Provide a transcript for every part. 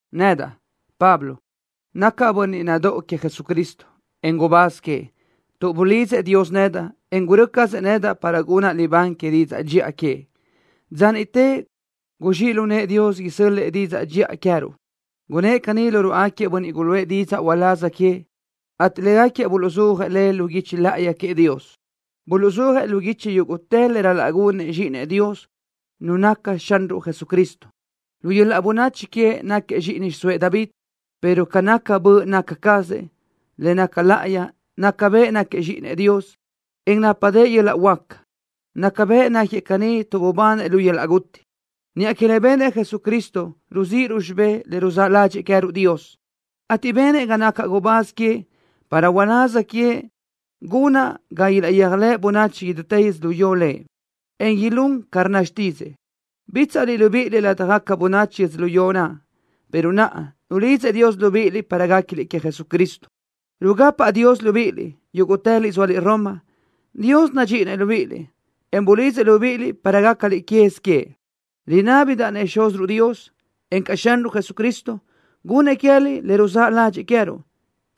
Nedaʼ, Pablo, nacaʼ bönniʼ nadóʼo queëʼ Jesucristo, en gubáz queëʼ, tuʼ bulidzëʼ Dios nedaʼ, en gurö́ cazëʼ nedaʼ para gunaʼ libán que didzaʼ dxiʼa queëʼ. Dza niʼte guzxíʼ lu nëʼë Dios isö́l-lëʼë didzaʼ dxiʼa naʼ queë́ruʼ. Gunnë́ʼ caní lu ruáʼagaquiëʼ bönniʼ guluʼë didzaʼ uláz queëʼ, ateʼ légaquiëʼ buluʼzúajëʼ le lu guichi láʼayi queëʼ Dios. Buluʼzúajëʼ lu guichi yúguʼtë le ral-laʼ gunëʼ Zxíʼinëʼ Dios, Nu naʼ naca Xanruʼ Jesucristo. Lu yöl-laʼ bönachi queëʼ náquiëʼ zxíʼini xiʼsóëʼ David, pero ca naca böʼ naca cazëʼ, le naca láʼayi, naca bëʼ náquiëʼ Zxíʼinëʼ Dios, en nápadëʼë yöl-laʼ huáca. Naca bëʼ náquiëʼ caní tuʼ bubanëʼ lu yöl-laʼ guti. Niʼa que le benëʼ Jesucristo ruzíʼiruʼ xibé le ruzáʼ ládxëʼë queë́ruʼ Dios, ateʼ benëʼ ga nacaʼ gubáz queëʼ para uláz queëʼ Lëʼ gunaʼ ga ilaʼyéajlëʼ bönachi idútë yödzölió Lëʼ, en ilún ca rnna xtídzëʼë. Bítsaʼliʼ libíʼiliʼ ládjagaca bönachi yödzölió naʼ, pero naʼa nulidzëʼ Dios libíʼiliʼ para guéquiliʼ queëʼ Jesucristo. Rugapaʼ Dios libíʼiliʼ, yúguʼtëliʼ zóaliʼ Roma. Dios nadxíʼinëʼ libíʼiliʼ, en bulidzëʼ libíʼiliʼ para gácaliʼ quez queëʼ. Rinábidaʼ-nëʼ Xúziruʼ Dios, encaʼ Xanruʼ Jesucristo, gunnëʼ queë́liʼ le ruzáʼ ládxëʼë queë́ruʼ,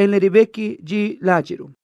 en le ribequi dxi ládxiʼruʼ.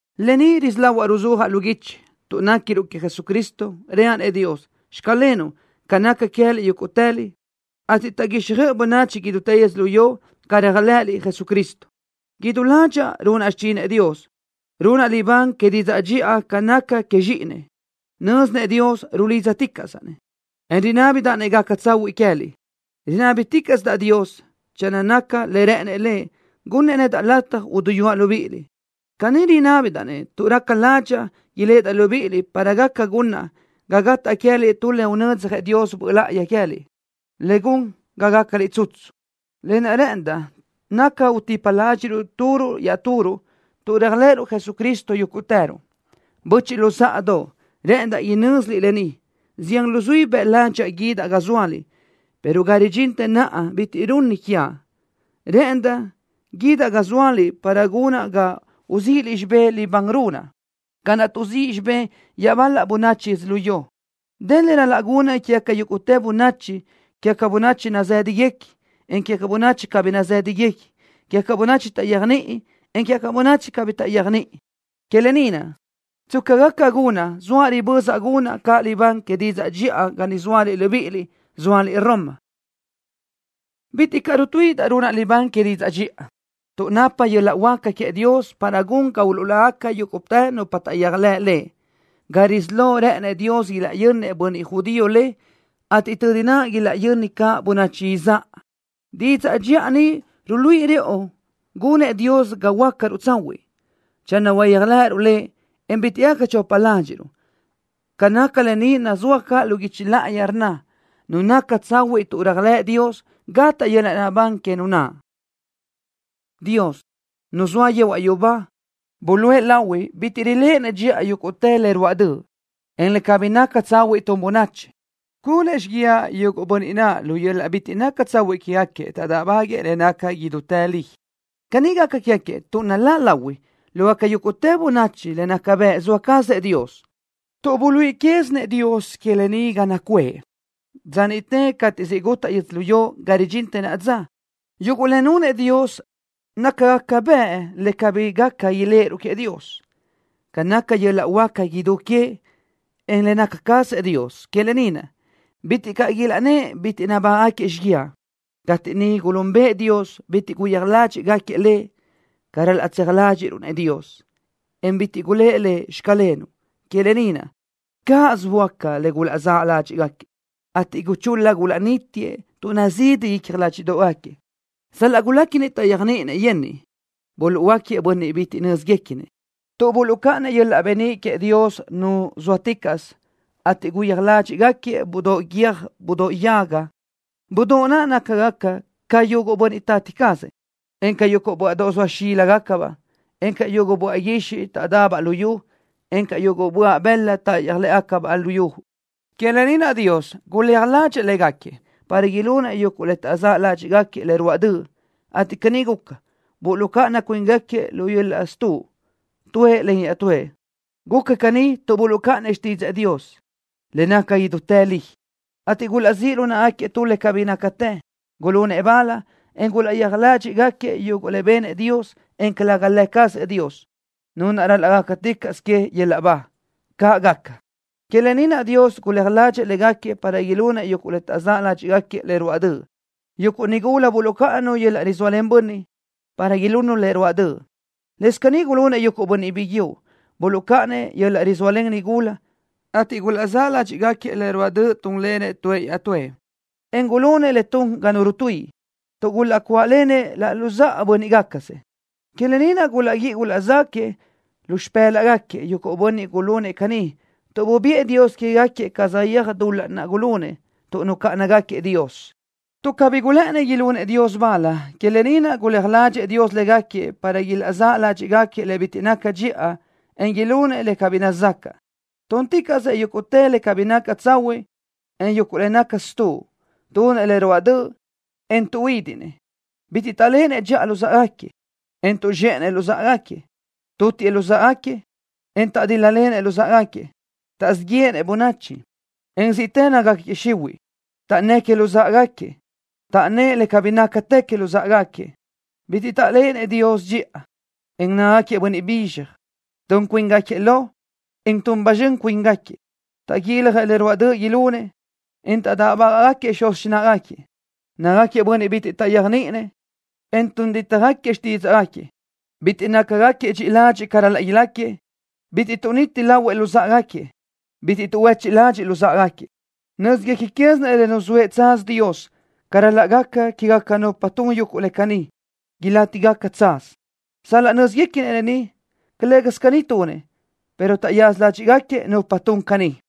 Lë ni risí lahuaʼ ruzúajaʼ lu guichi: Tuʼ néquiruʼ queëʼ Jesucristo reaʼ-nëʼ Dios: “Xclenuʼ” ca naca queë́liʼ yúguʼtëliʼ, ateʼ taʼguixjöʼ bönachi idútë yödzölió ca réajlëʼëliʼ Jesucristo. Idú ládxaʼa runaʼ xichinëʼ Dios, runaʼ libán que didzaʼ dxiʼa ca naca queëʼ Zxíʼinëʼ. Nö́zinëʼ Dios rulídzaticaʼsaʼ-nëʼ, en rinábidaʼ-nëʼ gaca tsahuiʼ queë́liʼ. Rinábiticaʼsidaʼ Dios, channö naca le rë́ʼënëʼ Lëʼ, gunnëʼ nedaʼ lataj uduyúaʼ libíʼiliʼ. Caní rinábidaʼ-nëʼ tuʼ raca ládxaʼa iléʼedaʼ libíʼiliʼ para gaca gunaʼ ga gataʼ queë́liʼ tu le unödzjëʼ Dios Böʼ Láʼayi queë́liʼ, le gun ga gácaliʼ tsutsu. Lë naʼ rë́ʼëndaʼ naca utipa ládxiʼruʼ turuʼ iaʼturuʼ, tuʼ réajlëʼëruʼ Jesucristo yúguʼtëruʼ. Böchiʼ luzáʼadoʼ, rë́ʼëndaʼ inö́ziliʼ lë ni. Zián luzuí bëʼ ládxaʼa guídaʼ ga zóaliʼ, pero ga ridxintë naʼa bitiʼ runni quiaʼ. Rë́ʼëndaʼ guídaʼ ga zóaliʼ para gunaʼ ga uzíʼiliʼ xibé libán naʼ runaʼ, ca naʼ tuʼzíʼ xibé iaʼbal-la bönachi yödzölió ni. Dë le ral-laʼ gunaʼ quégaca yúguʼtë bönachi, quégaca bönachi nazë́dagaca, en quégaca bönachi cabí nazë́dagaca, quégaca bönachi taʼyéajniʼi, en quégaca bönachi cabí taʼyéajniʼi. Que lë ni naʼ, tsca gaca gunaʼ, zoaʼ ribözaʼ gunaʼ caʼ libán que didzaʼ dxiʼa ga niʼ zóaliʼ libíʼiliʼ, zóaliʼ Roma. Bitiʼ caʼ rutuíʼidaʼ runaʼ libán que didzaʼ dxiʼa, tuʼ napa yöl-laʼ huáca queëʼ Dios para gun ga uluʼlágaca yúguʼtë nupa taʼyéajlëʼ le. Ga risí lo, rë́ʼënëʼ Dios ilaʼyönnëʼ bönniʼ judío le, ateʼ tödi naʼ ilaʼyöni caʼ bönachi izáʼa. Didzaʼ dxiʼa ni ruluíʼi rëʼu gunëʼ Dios ga huöácaruʼ tsahuiʼ, channö uyéajlëʼëruʼ Lëʼ, en bitiʼ gaca chopa ládxiʼruʼ. Ca naca lë ni nazúaj caʼ lu guichi láʼayi, rnna: “Nu naca tsahuiʼ tuʼ réajlëʼ Dios, gataʼ yöl-laʼ naʼbán que nu naʼ.” Dios, Nu zoa yehuaʼ yubá, buluʼe lahui bitiʼ riléʼenëʼ dxiʼa yúguʼtë le ruáʼ döʼ, en le cabí naca tsahuiʼ tun bönachi. Gunëʼ xíguiaʼ yuguʼ bönniʼ naʼ, lu yöl-laʼ bitiʼ naca tsahuiʼ quégaquiëʼ taʼdáʼbaguëʼë le naca idútë li. Caní gaca quégaquiëʼ tuʼ naláʼ lahui lógaca yúguʼtë bönachi le naca bëʼ zoa cazëʼ Dios, tuʼ buluíʼi quézinëʼ Dios lë ni ga naʼ nacuʼë. Dza niʼte cateʼ siʼ gutaʼ yödzölió, ga ridxintë naʼa dza, yuguʼ le nunëʼ Dios nácagaca bëʼ le cabí gaca iléʼeruʼ queëʼ Dios, ca naca yöl-laʼ huáca idú queëʼ, en le naca cazëʼ Dios. Que lë ni naʼ, bitiʼ gaca ilaʼnnë́ʼ bitiʼ nabágaʼgaquiëʼ xíguiaʼ. Cateʼ niʼ gulúnbëʼë Dios, bitiʼ gulaʼyéaj ládxiʼgaquiëʼ Lëʼ ca ral-laʼ tseaj ládxiʼruʼ-nëʼ Dios, en bitiʼ gulë́ʼ Lëʼ: “Xclenuʼ.” Que lë ni naʼ, cáʼasö böáca le gulaʼzáʼ ládxiʼgaquiëʼ, ateʼ gulaʼchul-la gulaʼnítiëʼ tuʼ nazidi icja ládxiʼdoʼgaquiëʼ. Sal-laʼ guléquinëʼ taʼyéajniʼinëʼ yenniʼ, buluʼhuöáquiëʼ bönniʼ bitiʼ bi nö́zguequinëʼ tuʼ buluʼcáʼanëʼ yöl-laʼ beníʼ queëʼ Dios Nu zóaticaʼsö, ateʼ gulaʼyéaj ládxiʼgaquiëʼ budóʼ guiö́j budóʼ yaga, budóʼ naʼ nácagaca ca yuguʼ bönniʼ tati cazëʼ, en ca yuguʼ böaʼdoʼ zoa xíligacabaʼ, en ca yuguʼ böaʼ guixiʼ taʼdabaʼ lu yu, en ca yuguʼ böaʼ bëla táʼayöj lë́ʼëbaʼ lu yu ni. Que lë ni naʼ Dios guléaj ládxëʼë légaquiëʼ para ilunëʼ yuguʼ le taʼzë́ ládxiʼgaquiëʼ le ruáʼ döʼ, ateʼ caní guca, buluʼcáʼana cuíngaquiëʼ lu yöl-laʼ stuʼ tuëʼ len iaʼtúëʼ. Guca caní tuʼ buluʼcáʼanëʼ xtídzëʼë Dios, le naca idútë li, ateʼ gulaʼzíʼ lu náʼagaquiëʼ tu le cabí nácatë. Gulunëʼ bal, en gulaʼyéaj ládxiʼgaquiëʼ yuguʼ le benëʼ Dios, en calëga Lë cazëʼ Dios, Nu naʼ ral-laʼ gácaticaʼsö queëʼ yöl-laʼ ba. ¡Caʼ gaca! Que lë ni naʼ Dios guléaj ládxëʼë légaquiëʼ para ilunëʼ yuguʼ le taʼzë́ ládxiʼgaquiëʼ le ruáʼ döʼ. Yuguʼ nigula buluʼcáʼananu yöl-laʼ rizóalen bönniʼ, para ilunnu le ruáʼ döʼ. Lëscaʼ caní gulunëʼ yuguʼ bönniʼ biguiúʼ, buluʼcáʼanëʼ yöl-laʼ rizóalen nigula, ateʼ gulaʼzë́ ládxiʼgaquiëʼ le ruáʼ döʼ túnlenëʼ tuëʼ iaʼtúëʼ, en gulunëʼ le tun ga nu rutuíʼi, tuʼ gulaʼcuáʼlenëʼ laʼ luzáʼa bö́nniʼgacasëʼ. Que lë ni naʼ gulaʼguíʼi gulaʼzáquiëʼ lu xipë́laʼgaquiëʼ yuguʼ bönniʼ gulunëʼ caní tuʼ bubiʼë Dios quégaquiëʼ ca saʼyéaj dul-laʼ naʼ gulunëʼ tuʼ nucáʼanagaquiëʼ Dios. Tuʼ cabí gulë́ʼënnëʼ ilunëʼ Dios bal, que lë ni naʼ guléaj ládxëʼë Dios légaquiëʼ para ilaʼzáʼ ládxiʼgaquiëʼ le bitiʼ naca dxiʼa, en ilunëʼ le cabí nazacaʼ. Túnticaʼsëʼ yúguʼtë le cabí naca tsahuiʼ, en yuguʼ le naca stuʼ. Tunëʼ le ruáʼ döʼ, en tuʼhuídiʼnëʼ. Bitiʼ taʼléʼenëʼ dxiʼa luzáʼagaquiëʼ, en tuʼzxéʼenëʼ luzáʼagaquiëʼ. Tutiëʼ luzáʼagaquiëʼ, en taʼdíl-lalenëʼ luzáʼagaquiëʼ. Taʼzíʼ yéʼenëʼ bönachi, en ziʼtë nácagaquiëʼ xihuiʼ. Taʼnnë́ʼ que luzáʼagaquiëʼ. Taʼnnë́ʼ le cabí nácatë que luzáʼagaquiëʼ. Bitiʼ taʼléʼenëʼ Dios dxiʼa, en nácagaquiëʼ bönniʼ bizxaj. Tun cuíngaquiëʼ lo, en tun ba zxön cuíngaquiëʼ. Taʼguiljëʼ le ruáʼ döʼ ilunëʼ, en taʼdáʼbaguëʼë xuz xináʼagaquiëʼ. Nácagaquiëʼ bönniʼ bitiʼ taʼyéajniʼinëʼ, en tun dítjagaquiëʼ xtídzaʼgaquiëʼ. Bitiʼ nácagaquiëʼ dxiʼi ladxiʼ ca ral-laʼ ilácagaquiëʼ. Bitiʼ tuʼniti lahuëʼ luzáʼagaquiëʼ. Bitiʼ tuʼhuechiʼ ládxiʼgaquiëʼ luzáʼagaquiëʼ. Nö́zguequi quézinëʼ le nuzóëʼ tsaz Dios ca ral-laʼ gaca quégaca nupa tun yuguʼ le caní, ilátigaca tsaz. Sal-laʼ nö́ziguequinëʼ lë ni, calë́gasö caní tunëʼ, pero taʼyaza ládxiʼgaquiëʼ nupa tun caʼ caní.